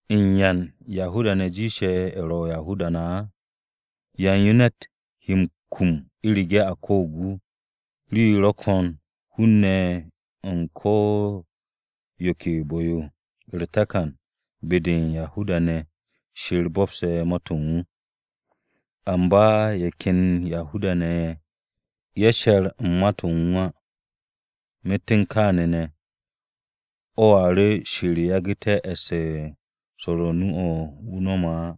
¿U̱n yan-Yahuda-ne̱ jiishe̱ ye̱ ro̱ Yahuda-ne̱ á? ¿Yan yo ne̱t he m-kum u̱rege̱ a ko̱o̱g wu̱? Rii ro̱ ko̱n hun-ne̱ u̱n ko̱ yo ke bu̱-yo! U̱r-takan, be-de u̱n Yahuda-ne̱ Shir bo̱pse̱ Ma-to̱ u̱n wu̱. Amba ye̱ ken Yahuda-ne̱ ye̱, ye̱ she̱r u̱n Ma-to̱ u̱n wu̱ á. Myet u̱n kaane̱ ne̱, o̱a ru̱ Shir yagu̱te̱ e̱ss u̱n swo̱r o-nu o̱ u̱n wu̱ á.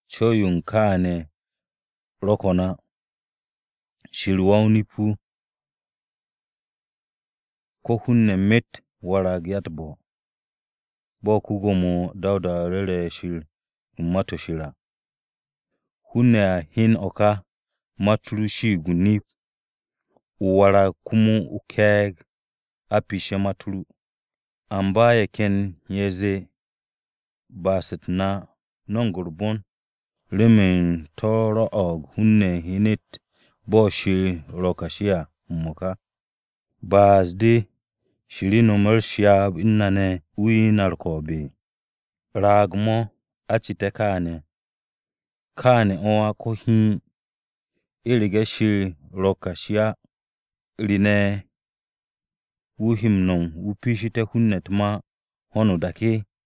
Co̱w-yo u̱n kaane̱ ro̱ ko̱n á! Shir wa-o-nip-wu̱ ko̱ hun-ne̱ myet warag ya-u̱t-bo̱, bo̱ ko-Gwo̱mo Dawuda ru̱re̱ Shir u̱n Ma-to̱ Shir à: “Hun-ne̱ a hyan o̱ ka, ma-u̱t ru shiig o-nip, o warag komo o-ke̱e̱g a piishe̱ ma-u̱t ru.” Amba, ye̱ ken ye̱ a zee, “Ba'as-u̱t na no̱mo̱g u̱r-bon, remen to̱ rwo̱'o̱g hun-ne̱ hyenet bo̱ Shir ro̱ kashi à m-mo̱ka. ¿Ba'as-de Shir nome̱ u̱s-ryaab u̱n na ne̱ wu̱ 'ye na u̱r-ko̱o̱b?” Raag-mo̱ a cite̱ kaane̱. Kaane̱ o̱ á ko̱ hiin! U̱rege̱ Shir ro̱ kashi á ¿re ne̱ wu̱ he m-no̱m wu̱ piishite̱ hun-ne̱ u̱t-ma ho̱no o-dak?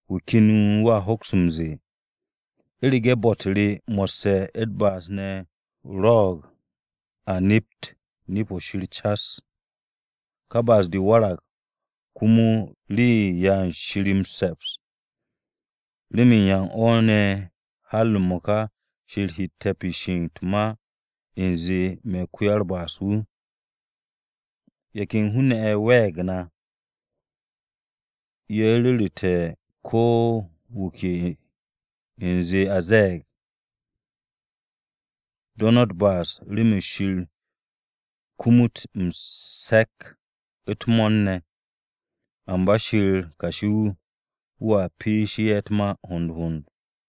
Wu̱ ken wu̱a hoks m-ze̱e̱, “U̱rege̱ bo̱-u̱t re mo̱sse̱ u̱r-ba'as ne̱ rwo̱'o̱g a nept nip-o̱ Shir cas, ka ba'as-de warag komo rii-yo u̱n 'ya u̱n Shir m-se̱ps, ¿remen yan o̱ ne̱ har m-mo̱ka Shir hette̱ me̱ piishe̱ u̱t-ma u̱nze me̱ ko-wa-u̱r-ba'as wu̱?” Ye̱ ken hun-ne̱ ye̱ we̱e̱g na, ye̱ ru̱ru̱te̱ ko̱ wu̱ ke u̱nze a ze̱e̱g, “Do̱ no̱ u̱t-ba'as remen Shir kumut m-se̱k u̱t-mo̱o̱r ne̱!” Amba Shir kashi-wu̱, wu̱a piishi ye̱ u̱t-ma hond hond.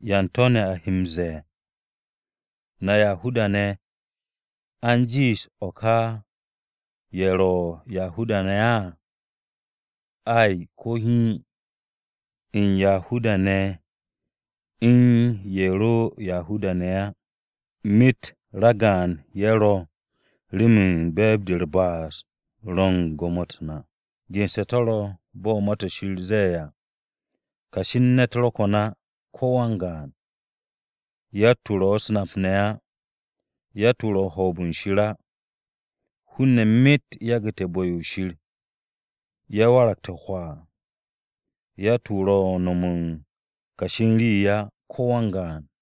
¿Yan to̱ ne̱ a he m-ze̱e̱? ¿Na Yahuda-ne̱ a u̱n jiish o̱ ka ye̱ ro̱ Yahuda-ne̱ á? Ay! Ko̱ hiin! U̱n Yahuda-ne̱ u̱n ye̱ ro̱ Yahuda-ne̱ á, myet ragaan ye̱ ro̱ remen be̱e̱b-de u̱r-ba'as ro̱ u̱n gwo̱mo-u̱t na. Gense̱ to̱ ro̱ bo̱ Ma-to̱ Shir ze̱e̱ à: “Kashi u̱n ne̱t ro̱ ko̱n á, ko̱ wan-gaan, yatt-wu̱ ro̱ u̱s-nap ne̱ á. Yatt-wu̱ ro̱ u̱n hoob-o̱ u̱n Shir á. Hun-ne̱ myet yagu̱te̱ bu̱-yo Shir, ye̱ waragte̱ hwaa. Yatt-wu̱ ro̱ u̱n no̱m u̱n kashi u̱n rii á, ko̱ wan-gaan.”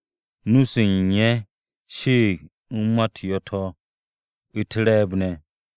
“Nu-se u̱n ye̱ shiig u̱n ma-u̱t yo̱-to̱, u̱t-re̱e̱b ne̱.”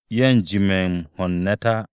“Ye̱ u̱n jime̱ m-ho̱ u̱n ne̱t á.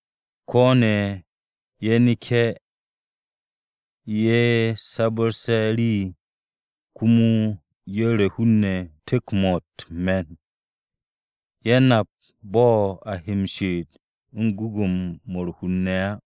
Ko̱ kene̱ ye̱ neke̱ se̱ ye̱ sabu̱rsu̱te̱ rii, komo ye̱ ru̱ hun-ne̱ tu̱k-mo̱ u̱t-me̱n. Ye̱ nap bo̱ a he m-she'et u̱n gwu̱gwu̱-mo̱ u̱r-hur ne̱ á.”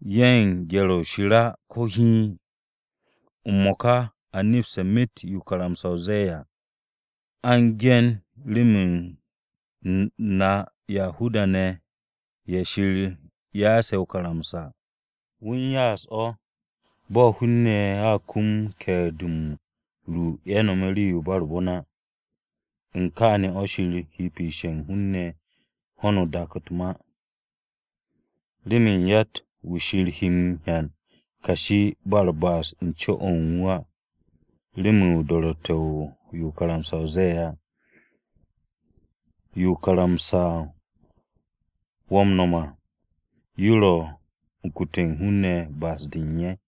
“Ye̱ u̱n gye̱r-o̱ u̱n Shir á, ko̱ hiin.” M-mo̱ka a nepste̱ myet yo karamsa-o ze̱e̱ à, a u̱n ge̱n rem na Yahuda-ne̱ ye̱ Shir ya'ase̱ o-karamsa à. Wu̱ u̱n ya'as o̱ bo̱ hun-ne̱ a kum ke̱e̱r-de m-ru ye̱ nome̱ rii-yo u̱n ba u̱r-bon á. U̱n kaane̱ o̱ Shir he piishe̱ u̱n hun-ne̱ ho̱n o-da u̱t-ma. Remen yatt-wu̱ Shir he m-hyan kashi ba u̱r-ba'as u̱n co-o̱ u̱n wu̱ á, remen do̱ro̱tte̱-o̱ u̱n yo karamsa-o ze̱e̱ à. Yo karamsa-o wo̱ m-no̱m à yo ro̱ kute̱ u̱n hun-ne̱ ba'as-de u̱n ye̱.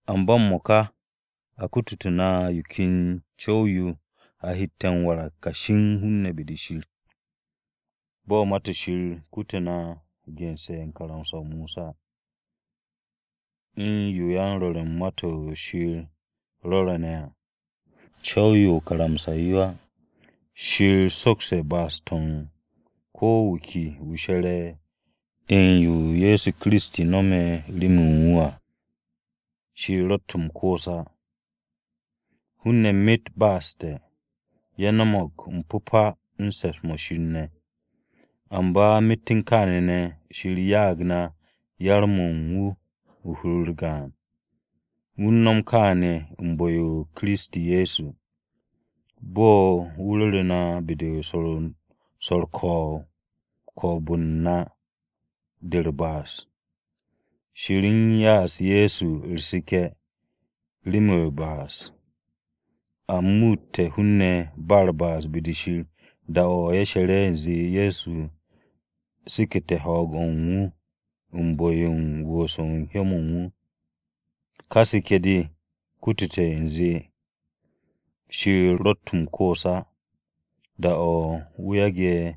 Amba m-mo̱ka a kututu̱ na yo ken co̱w-yo a hette̱ m-warag kashi u̱n hun-ne̱ be-de Shir à. Bo̱ ma-to̱ Shir kutu na gense̱ u̱n karamsa-o Mosa, u̱n yo yan-rwo̱r u̱n ma-to̱ Shir rwo̱re̱ ne̱ à. Co̱w-yo o-karamsa yo á. Shir sokste̱ ba'as-to̱ u̱n ko̱ wu̱ ke wu̱ she̱re̱ u̱n yo Ye̱so Kiristi no̱me̱ remen wu̱ à. Shir ro̱tt m-koos á. Hun-ne̱ myet ba'asu̱te̱, ye̱ no̱mo̱g m-pu̱pa u̱n se̱ps-mo̱ Shir ne̱. Amba myet u̱n kaane̱ ne̱ Shir ya'ag na yar-mo̱ u̱n wu̱ hur-u̱r gaan. Wu̱ u̱n no̱m kaane̱ u̱n bu̱-o Kiristi Ye̱so, bo̱ wu̱ rure̱ na be-de swo̱r u̱r-ko̱o̱b u̱n na de u̱t-ba'as. Shir u̱n ya'as Ye̱so u̱r-seke̱ remen u̱r-ba'as. A muutte̱ hun-ne̱ ba u̱r-ba'as be-de Shir da-o̱ ye̱ she̱re̱ u̱nze Ye̱so sekete̱ ho̱o̱g-o̱ u̱n wu̱ u̱n bu̱-yo u̱n wu̱u̱s u̱n hyó-mo̱ u̱n wu̱ à. Ka seke̱-de kutute̱ u̱nze Shir ro̱tt m-koos á da-o̱ wu̱ yage̱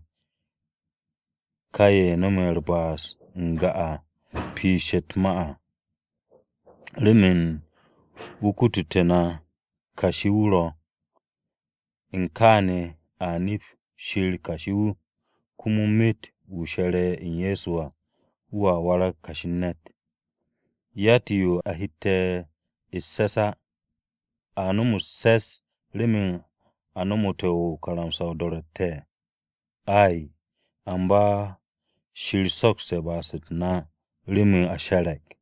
ka ye̱ no̱me̱ u̱r-ba'as n-ga piishe̱ u̱t-ma á, remen wu̱ kututé̱ na kashi-wu̱ ro̱. U̱n kaane̱, a nep Shir kashi-wu̱ komo myet wu̱ she̱re̱ u̱n Ye̱so à, wu̱a warag kashi u̱n ne̱t. Yatt-yo a hette̱ u̱s-se̱s á! ¿A no̱m u̱s-se̱s remen a nomote̱ o-karamsa o-do̱ro̱tte̱? Ay! Amba Shir so'oste̱ ba'as-u̱t na remen a she̱re̱g.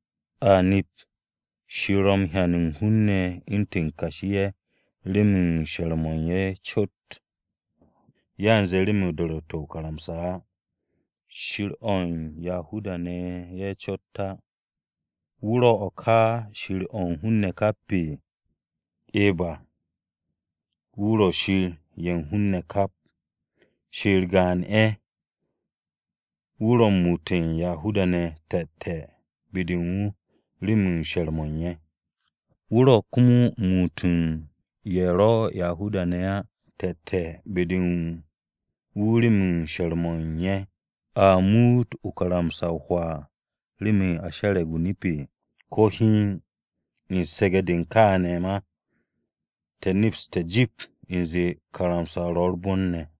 A nep Shir ro̱ m-hyan u̱n hun-ne̱ u̱ntu̱n kashi-ye̱ remen she̱r-mo̱ u̱n ye̱ cot, yanze remen do̱ro̱tte̱-o̱ o-karamsa á. Shir-o̱ u̱n Yahuda-ne̱ ye̱ cot á. ¿Wu̱ ro̱ ka Shir o̱ u̱n hun-ne̱ kap? Eba, wu̱ ro̱ Shir ye̱ u̱n hun-ne̱ kap. Shir gaan ye̱, wu̱ ro̱ u̱n muut u̱n Yahuda-ne̱ te̱te̱ be-de u̱n wu̱ remen she̱r-mo̱ u̱n ye̱. Wu̱ ro̱ komo m-muut u̱n ye̱ ro̱ Yahuda-ne̱ á te̱te̱ be-de u̱n wu̱ remen she̱r-mo̱ u̱n ye̱. ¿A muut o-karamsa hwaa remen a she̱re̱g o-nip? Ko̱ hiin, u̱n su̱ge̱-de u̱n kaane̱ ma, te̱ nepste̱ jip u̱nze karamsa-o ro̱ u̱r-bon ne̱.